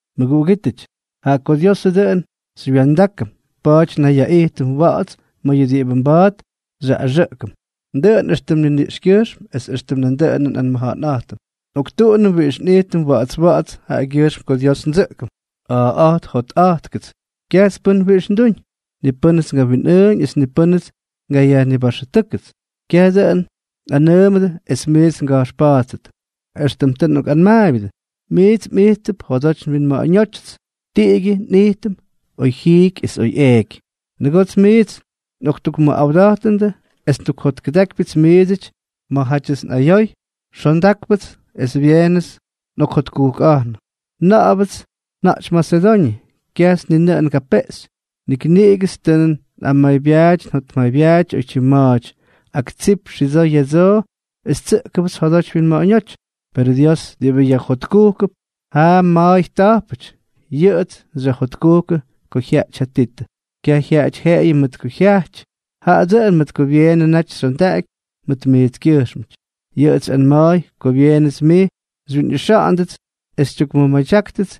Mʉguꞌugítʉty, jaꞌa ko Diosʉ dʉꞌʉn xymyʉwa̱ndákʉm, pa̱a̱ty nnayyaꞌijtʉm wa̱ꞌa̱ts ma̱ yʉ diꞌibʉ mba̱a̱t xyaꞌꞌaxʉꞌkʉm, dʉꞌʉn éxtʉm nniniꞌxkyʉjxm es éxtʉm nandʉꞌʉnʉ nꞌanmʉja̱ꞌa̱nꞌa̱jtʉm. Nꞌoktuꞌunʉm wiꞌix nꞌijtʉm wa̱ꞌa̱ts wa̱ꞌa̱ts jaꞌagyʉjxm ko Dios ndsʉꞌkʉm. A̱a̱ꞌa̱jt jotꞌa̱jttʉgʉts. Kyajts pʉ́n wiꞌix nduñ. Ni pʉ́nʉts ngawinꞌʉʉñ es ni pʉ́nʉts ngayajnibaxʉtʉ́kʉts. Kyaj dʉꞌʉn nꞌanʉʉmʉdʉ es miits nga̱jxpa̱a̱ttʉt, éxtʉm tʉ nꞌokꞌanmaabyʉdʉ, miits mꞌijttʉp njodoty nwinma̱ꞌa̱ñótyʉts, tiꞌigyʉ nꞌijtʉm oy jiiky es oy eeky. Nʉgoots miits nꞌoktukmʉꞌawda̱jtʉnʉ es ndukjotkʉdákypyʉts miidsʉty ma̱játyʉts nꞌayoy, xondákypyʉts es byeenʉts nꞌokjotkujkꞌa̱jnʉ. Na̱ꞌa̱bʉts nja̱jty Masedoñʉ, kyajts ni nʉꞌʉn ngapeꞌxy, nik niꞌigʉts tʉ nꞌamaybyaaty njotmaybyaaty oytyim ma̱a̱ty. Ak tsip xidsoo ya̱dsoo es tsʉꞌkʉbʉts jodoty winma̱ꞌa̱ñóty, perʉ Dios, diꞌibʉ yajjotkujkʉp ja ma̱a̱y ta̱jpʉty, yʉꞌʉts xyajjotkujkʉ ko jyajty ja Titʉ. Kyaj jyaꞌayʉty jeꞌeyʉ mʉt ko jyajty, jaꞌa dʉꞌʉn mʉt ko byeenʉ naty xyondaꞌaky mʉt miitskyʉjxmʉty. Yʉꞌʉts xyꞌanma̱a̱y ko byeenʉts miits xywyinꞌixa̱ꞌa̱ndʉts, es xytyukmʉmadyákʉts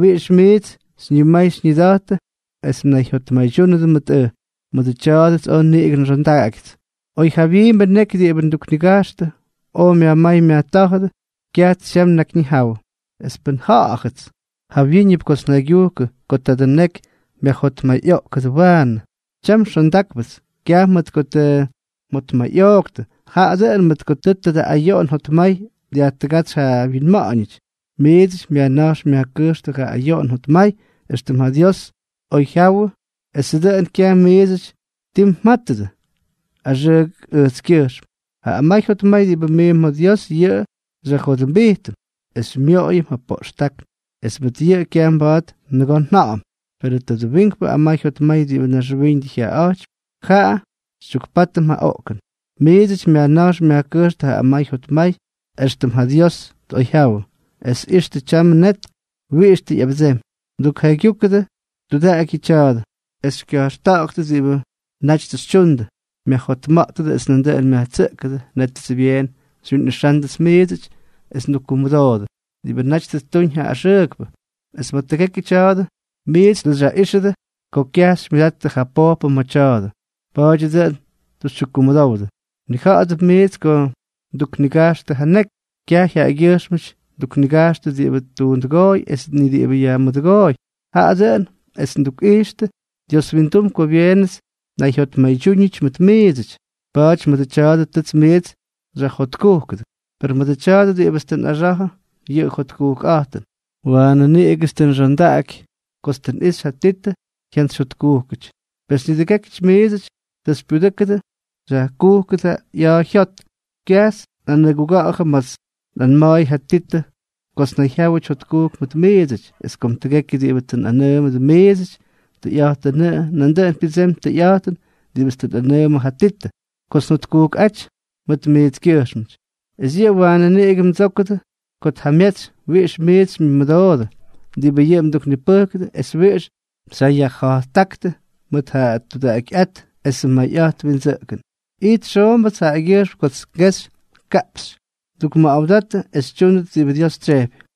wiꞌix miits xyñimay xyñida̱jtʉts es mnayjyotmaydyúnʉdʉ mʉt ʉj. Mʉdʉ tya̱a̱dʉts oj niꞌigʉ nxondaꞌagyʉts. Oy ja jawyiimbʉ neky diꞌibʉ nduknigajxtʉ oj myajmáy myajtá̱jʉdʉ, kyajts tyam nnakyjyawʉ. Es pʉn nja̱ꞌa̱jʉts jawyíñʉp kots njaygyujkʉ ko tadʉ neky myajjotmayꞌoꞌkʉdʉ waanʉ, tyam xondáknʉpts, kyaj mʉt ko tʉ mjotmayꞌooktʉ, jaꞌa dʉꞌʉn mʉt ko tʉ tadʉ ayoꞌon jotmay dyajtʉgátsy ja mwinma̱ꞌa̱ñʉty. Miidsʉty myajna̱jx myajkʉjxtʉ ja ayoꞌon jotmay éxtʉm ja Dios tꞌoyjyawʉ esʉ dʉꞌʉn kyaj miidsʉty tii mja̱jtʉdʉ axʉʉk ʉjtskyʉjxm. Ja amay jotmay diꞌibʉ miimp ma̱ Dios, yʉꞌʉ xyajjodʉmbijtʉm es xymyoꞌoyʉm ja poꞌxtákn, es mʉt yʉꞌʉ kyaj mba̱a̱t nʉgoo nja̱ꞌa̱m. Perʉ tadʉ wiinkpʉ amay jotmay diꞌibʉ naxwiiñʉdʉ jyaꞌaꞌa̱jtypy, jaꞌa xytyukpátʉm ja oꞌkʉn. Miidsʉty myajna̱jx myajkʉjxtʉ ja amay jotmay éxtʉm ja Dios tꞌoyjyawʉ. ¡Es ixtʉ tyamʉ net wiꞌix tʉ ꞌyabʉdsemy! Mdukjaygyujkʉdʉ tudaꞌaky yʉ tya̱a̱dʉ es xykya̱jxtuda̱ꞌa̱gʉt diꞌibʉ naty tʉ xytyundʉ, myajjotma̱ꞌtʉdʉ es nandʉꞌʉn myajtsʉꞌkʉdʉ, nétʉts byeen xywyinꞌixándʉts miidsʉty, es mdukkumʉdoodʉ diꞌibʉ naty tʉ ttuñ ja axʉʉkpʉ. Es ma̱ tʉgekyʉ tya̱a̱dʉ, miits tʉ xyaꞌíxʉdʉ ko kyaj xymyʉdattʉ ja pojpʉ ma̱ tya̱a̱dʉ. Pa̱a̱dyʉ dʉꞌʉn tʉ xytyukkumʉdowdʉ. Mnija̱ꞌa̱dʉp miits ko nduknigajxtʉ ja neky, kyaj jaꞌagyʉjxmʉp nduknigajxtʉ diꞌibʉ tuundʉgooy es ni diꞌibʉ yajmʉdʉgooy, jaꞌa dʉꞌʉn es ndukꞌixtʉ Dios windum ko byeenʉts nnayjyotmaydyúñʉty mʉt miidsʉty. Pa̱a̱ty mʉdʉ tya̱a̱dʉ tʉts miits xyajjotkujkʉdʉ. Per mʉdʉ tya̱a̱dʉ diꞌibʉts tʉ nꞌaxa̱jʉ yʉ jotkujkꞌa̱jtʉn, waanʉ niꞌigʉts tʉ nxondaꞌaky kots tʉ nꞌixy ja Titʉ jyantsyjyotkujkʉty; pes nidʉgékyʉty miidsʉty tʉ xypyudʉ́kʉdʉ xyajkujkʉdʉ ꞌya̱a̱ jyot. Kyajts nꞌanʉguga̱ꞌa̱jʉ ma̱ts nꞌanma̱a̱y ja Titʉ kots nnayjyáwʉty jotkujk mʉt miidsʉty. Es kom tʉgekyʉ diꞌibʉ tʉ nꞌanʉʉmʉdʉ miidsʉty, tʉyꞌa̱jtʉnʉꞌʉ, nandʉꞌʉn pyʉdseemy tʉyꞌa̱jtʉn diꞌibʉts tʉ nꞌanʉʉmʉ ja Titʉ kots njotkujkꞌáty mʉt miitskyʉjxmʉty. Es yʉꞌʉ waanʉ niꞌigʉ mdsókʉdʉ ko tjamyetsy wiꞌix miits xymyʉmʉdoodʉ diꞌibʉ yʉꞌʉ mduknipʉjkʉdʉ es wiꞌix xyajja̱jttáktʉ mʉt ja tudaꞌakyꞌát esʉ mayꞌa̱jt windsʉꞌkʉn. Ijt xoombʉts jaꞌagyʉjxm kots kexy kaꞌpxy ndukmʉꞌawdatʉ es xytyúndʉt diꞌibʉ Dios tsyejpy.